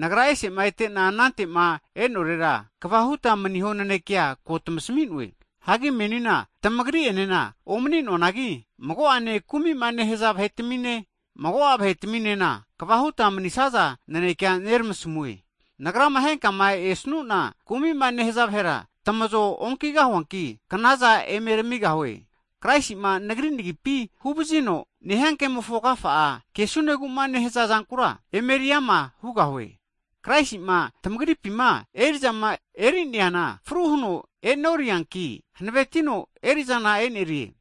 Nagra ese'ma ete'na anantema e'norera, kava huta maniho nanekea ko tamasmi'noe. Hagi menina tamagri enena omninoanagi, mago'ane kumima nehaza vahetamine, mago'a vahetaminena kva huta manisaza nanekea neramasamue. Nagrama henkama esnuna kumima nehaza vahera tamazo onkigahuanki, knaza emeramigahue. Kraisi'ma nagri nagipi huvazino nehia kemofo agafa'a kesuneguma nehaza zankura, emeri ama hugahie. Kraisi'ma tamagripima erizama eneriana fru huno e'norianki hanavetino erizana enerie.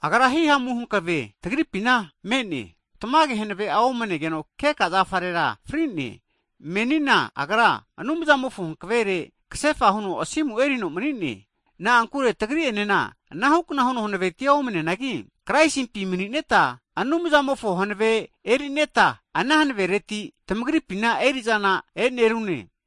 Agra himamu hankave tamagripina me'ne. Tamage, hanave'a omanegeno keka zafarera fri'ne. Menina Agra, Anumzamofo hankavere kasefa huno asimu erino mani'ne. Na'ankure tagri'enena anahukna huno hanavetia omneanagi, Kraisimpi mani'neta Anumzamofo hanave erineta, ana hanavereti tamagripina erizana e'nerune.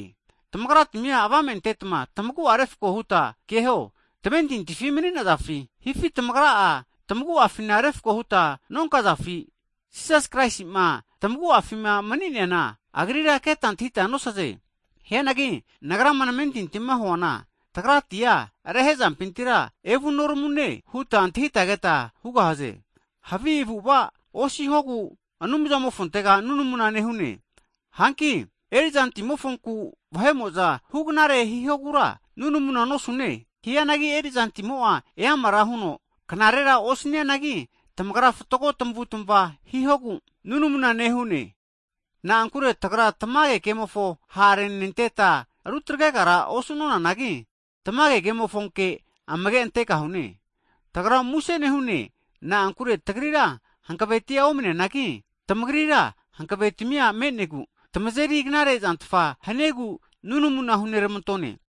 Tamagratmi'a avame antetma tamagu'a refko huta keho, tamentintifi maninazafi? Hifi tamagra'a tamaguafina refko huta nonkazafi, Jisas Kraisima tamaguafima mni'neana, Agrira keta antahita nosaze. Hianagi nagrama namentintima huana, tagratia rehezampintira evunoramune huta antahita keta hugahaze. Havi avu'ava osihogu Anumzamofontega nunamuna nehune. Hanki erizantimofonku vahe'mo'za huknare hihogura nunamuna nosune. Hianagi erizantimo'a eamara huno knarera osnianagi, tamagra fatgo tamavutmava hihogu nunamuna nehune. Na'ankure tagra tamage kemofo ha'renenteta rutagregara osunonanagi, tamage kemofonke amage antegahune. Tagra muse nehune, na'ankure tagrira hankavetia omne'neanagi, tamagrira hanavetmia me'negu, tamazeri knare zantfa haniegu nunamuna hunermantone.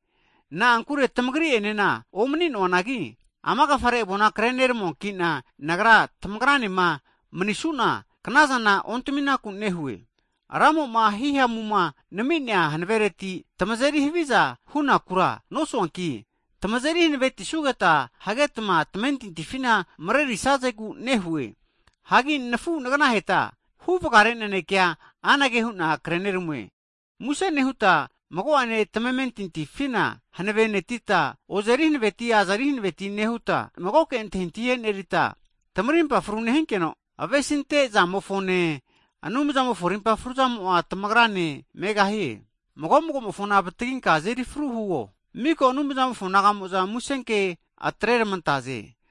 Na'ankure tamagri'enena omani'noanagi, ama agafare avona krenetamuanki'na, nagrama tamagranema manisuna knazana ontaminaku nehue. Ramo'ma himamuma nami'nea hanavereti, tamazeri haviza hunakura nosuanki, tamazeri hanavetisugeta hagetma tamentintifina marerisazegu nehue. Hagi nafu nagnaheta huvgare nanekea anage hu'na kreneramue, muse nehuta, mago'ane tamamentintifina hanavenetita, ozeri hanaveti azeri hanaveti nehuta, magoke antahintahi enerita, tamarimpa fru nehinkeno, avesinte zamofone, Anumzamofo rimpa fruzamo'a tamagrane megahie. Mago magomofona avataginka azeri fru huo. Miko Anumzamofo nagamo'za musenke atreramantaze.